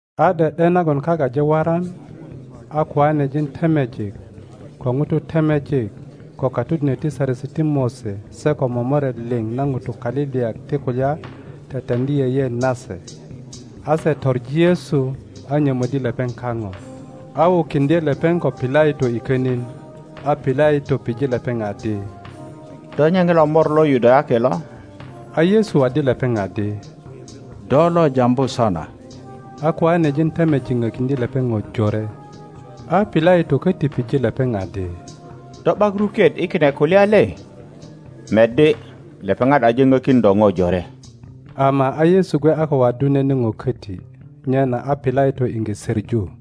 A ’de ’de nagon kak aje waran, A a koanejin temejik, ko ŋutu temejik, ko katodinök ti Saresi ti Mose se ko momoret liŋ na ŋutu kaliliyak ti kulya teteŋdi yeyeet nase; a se toŋi Yesu, a nyomöddi lepeŋ kaŋo, a wukiŋdye lepeŋ ko Pilato i könin. A Pilato pije lepeŋ adi, Do nye ŋilo Mor lo Yudayaki lo? A Yesu waddi lepeŋ adi, Do lo jambu sona. A koanejin temejik ŋökiŋdye lepeŋ ŋo jore. A Pilato köti pije lepeŋ adi, Do ’bak ruket i kine kulya le? Meddi, lepeŋat aje ŋökin do ŋo jore. Ama a Yesu gwe a ko waddu nene ŋo köti, nyena a Pilato iŋge söŋu.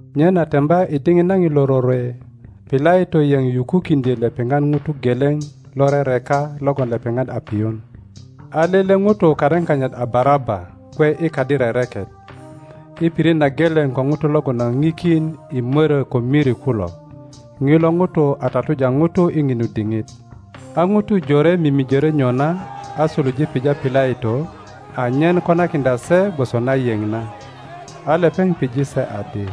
Nyena temba i diŋit na ŋilo rorwe Pilato yeŋ yukukiŋdyö lepeŋat ŋuto geleŋ lo rereka logon lepeŋat a piyun. A lele ŋuto karin kanyit a Baraba gwe i kadi rereket, i pirit na geleŋ ko ŋutu logon a ŋikin i mörö ko miri kulo, ŋilo ŋuto a tatuja ŋutu i ŋinu diŋit. A ŋutu jore mimijörö nyona a suluje pija Pilato anyen konakiŋdya se gwoso na yeŋ na. A lepeŋ pije se adi,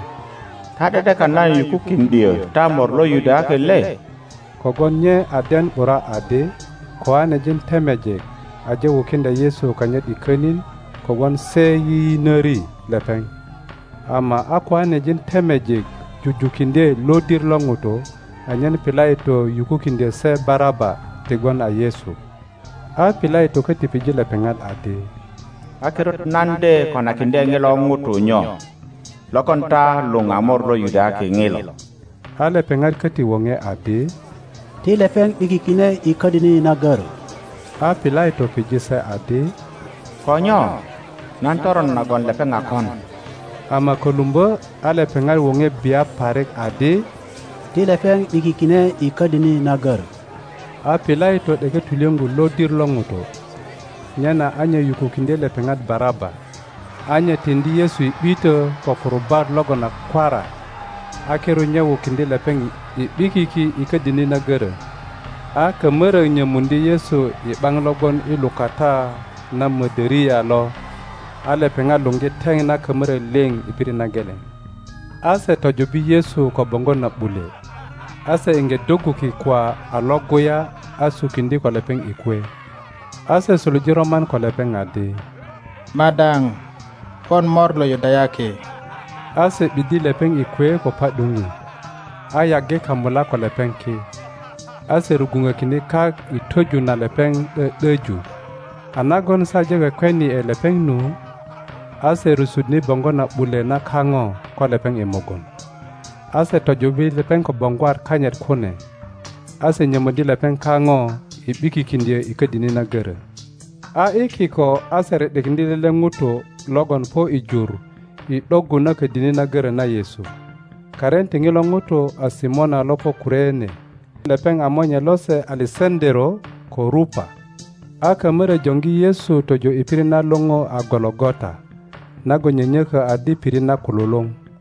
Ta ’de ’dekan nan yukukiŋdyö ta Mor lo Yudayaki le? Kogwon nye a den ’bura adi koanejin temejik aje wukiŋdya Yesu kanyit i könin kogwon se yiyinöri lepeŋ. Ama a koanejin temejik jujukiŋdye lodir lo ŋutu anyen Pilato yukukiŋdyö se Baraba ti gwon a Yesu. A Pilato köti pije lepeŋat adi, A kirut nan de konakiŋdye ŋilo ŋuto nyo logon ta luŋ a Mor lo Yudayaki ŋilo? A lepeŋat köti woŋe adi, Ti lepeŋ ’bikikine i ködini na görö! A Pilato pije se adi, Ko nyo? Nan toron nagon lepeŋ a kon? Ama kölumbö a lepeŋat woŋe bia parik adi, Ti lepeŋ ’bikikine i ködini na görö! a Pilato ’deke tulyöŋgu lodir lo ŋutu, nyena a nye yukukiŋdye lepeŋat Baraba; a nye tiŋdi Yesu i ’bitö ko kurubat logon a kwara, a kirut nye wukiŋdye lepeŋ i ’bikiki i ködini na görö. A kamörök nyömuŋdye Yesu i ’baŋ lo gwon i lukata na mödöria mödöriaKutuk na Roma luŋgu a Paraitorio lo; a lepeŋat luŋgi teŋ na kamörök liŋ i pirit na geleŋ. A se tojubbi Yesu ko boŋgo na ’bule, a se iŋge doggu kikwa a Iŋguya, a sukiŋdye ko lepeŋ i kwe. A se suluje roman ko lepeŋ adi, Madaŋ, pon Mor lo Yudayaki! A se ’biddye lepeŋ i kwe ko pa ’duŋi, a yaggi kamulak ko lepeŋ ki, a se rugwuŋökine kak i twöju na lepeŋ ’dö ’döju. A nagon se aje kwekweni ’e lepeŋ nu. a se rusuŋdye boŋgo na ’bule na kaŋo ko lepeŋ i mugun, a se tojubbi lepeŋ ko boŋgwat kanyit kune. A se nyömöddi lepeŋ kaŋo i ’bikikiŋdyö i ködini na görö. A i kiko a se ri ’dikiŋdye lele ŋuto logon po i jur i ’doggu na ködini na görö na Yesu. Karin ti ŋilo ŋuto a Simona lo po Kurene. Lepeŋ a monye lose Alesaŋöero ko Rupa. A kamörök joŋgi Yesu tojo i pirit na luŋu a Gologota (nagon nyönyökö adi Pirit na kululuŋ).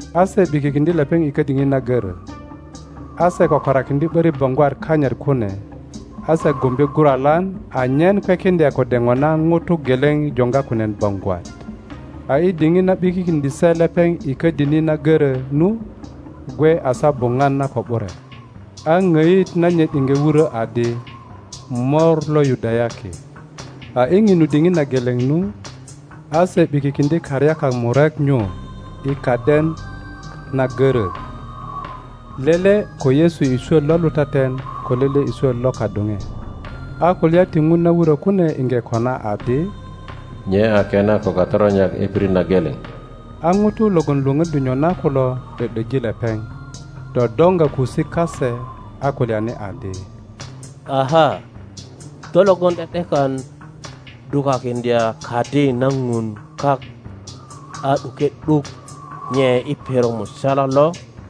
A se ’bikikiŋdye lepeŋ i ködini na görö, a se kökorakiŋdye ’börik boŋgwat kanyit kune, a se gumbe guralan anyen kwekiŋdya kode ŋona ŋuto geleŋ joŋga kunen boŋgwat. A i diŋit na ’bikikiŋdye se lepeŋ i ködini na görö nu gwe a saa buŋwan na ko ’bure. a ŋoit nanyit iŋge wurö adi, MOR LO YUDAYAKI. a i ŋinu diŋit na geleŋ nu, a se ’bikikiŋdye karyakak murek nyu i kaden na görö, lele ko Yesu i swot lo lutaten ko lele i swot lo kadoŋe. [ A kulya ti Ŋun na wurö kune iŋge kona adi, Nye a kena ko katoronyak i pirit na geleŋ.] A ŋutu logon lwöŋöddi nyona kulo ’dö ’döji lepeŋ, dodoŋga kusik kase, a kulyani adi, Aha! Do logon ’de ’dekan dukakiŋdya Kadi na Ŋun kak a ’duke ’duk nye i perok musala lo!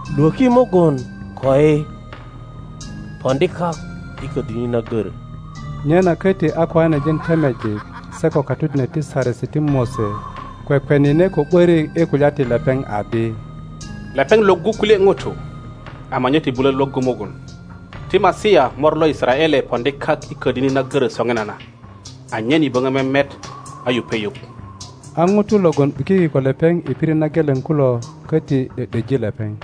Lwöki mugun koi! Poŋdi kak i ködini na görö! Nyena koti a koanejin temejik se ko katodinök ti Saresi ti Mose kwekwenine ko ’börik i kulya ti lepeŋ adi, Lepeŋ lwöggu kulye ŋutu; ama nye ti bulö lwöggu mugun. Ti Masia Mor lo Yisaraele poŋdi kak i ködini na görö soŋinana, anyen yi böŋö memet a yupe yuŋ. A ŋutu logon ’bikiki ko lepeŋ i pirit na geleŋ kulo köti ’do ’döji lepeŋ.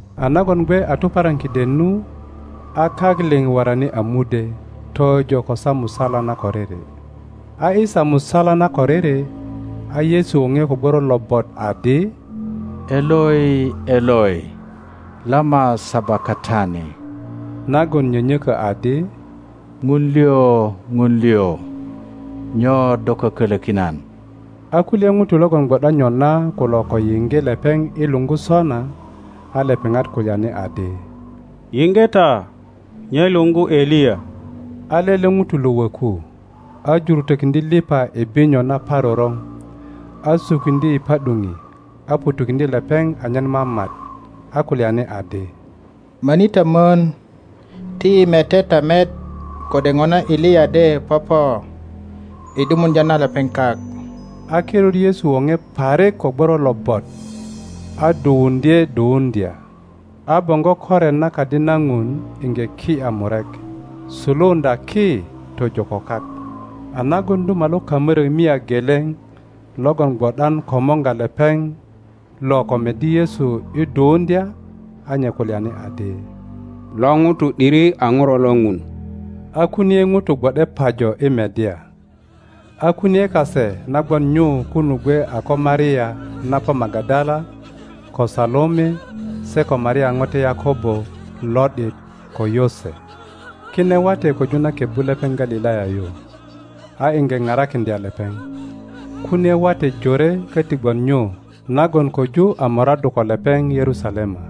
A nagon gwe a tuparan kiden nu, a kak liŋ worani a mudwe tojo ko saa musala na koriri. a i saa musala na koriri, a Yesu woŋe ko gworo lobot adi, Eloi, Eloi, lama sabakatani? nagon nyönyökö adi, Ŋun liŋ, Ŋun liŋ, nyo do kökölökin nan? a kulye ŋutu logon gwo ’dan nyona kulo ko yiŋge lepeŋ i luŋgu sona, a lepeŋat kulyani adi, Yiŋge ’ta, nye luŋgu Eliya. a lele ŋuto lo wöku, a jurutökiŋdye liŋa i binyo naparoroŋ, a sukiŋdye i pa ’duŋi, a ŋutukiŋdye lepeŋ anyen mamat, a kulyani adi, Möni ta mön, ti yi mete ta met kode ŋona Eliya de popo i ’dumuŋdya na lepeŋ kak. a kirut Yesu woŋe parik ko gworo lobot, a duwuŋdye duwuŋdya. A boŋgo koret na Kadi na Ŋun iŋge ki ’ya murek. suluuŋdya ki tojo ko kak. A nagon duma lo kamörök mia geleŋ logon gwo ’dan komorga lepeŋ lo ko meddi Yesu i duwuŋdya, a nye kulyani adi, Lo ŋuto ’diri a Ŋuro lo Ŋun. A kunie ŋutu gwo ’de pajo i meddya. A kunie kase na gwon nyu kunu gwe a ko Maria na po Magadala, ko Salome, se ko Maria ŋote Yakobo lo ’dit ko Yose. Kine wate köju na kebbu lepeŋ Galilaya yu a iŋge parakiŋdya lepeŋ. Kunie wate jore köti gwon nyu nagon koju a moraddu ko lepeŋ Yerusalema.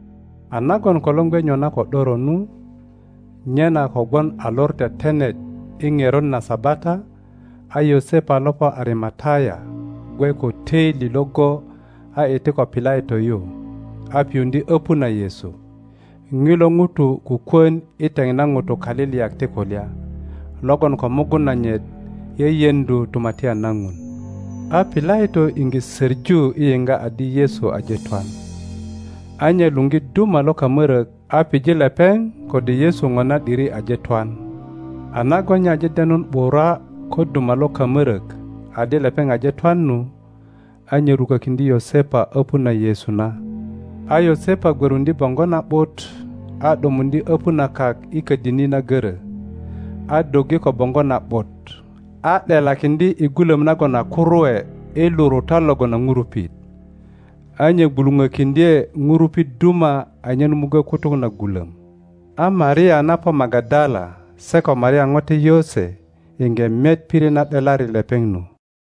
A nagon kolor gwe nyona ko ’doro nu, nyena kogwon a Lor Tetenet i ŋerot na Sabata, a Yosepa lo po Arimataya gwe ko töili iŋgo a iti ko Pilato yu a piyuŋdye öpu na Yesu. (Ŋilo ŋuto kukwon i teŋ na ŋutu kaliliyak ti kulya, logon ko mugun nanyit yeyeŋdu Tumatyan na Ŋun.) A Pilato iŋge soŋu i yiŋga adi Yesu aje twan, a nye luŋgi duma lo kamörök a pije lepeŋ kode Yesu ŋona ’diri aje twan. a nagon nye aje denun ’bura ko duma lo kamorök adi lepeŋ aje twan nu, a nye rukökiŋdye Yosepa öpu na Yesu na. A Yosepa gwöruŋdye boŋgo na ’but, a ’dumuŋdye öpu na kak i ködini na görö, a doggi ko boŋgo na ’but, a ’delakiŋdye i gulom nagon a kuruwe i lurutat logon a ŋurupit; a nye gwuluŋökiŋdye ŋurupit duma anyen muggo kutuk na gulom. A Maria na po Magadala se ko Maria ŋote Yose iŋge met pirit na ’delari lepeŋ nu.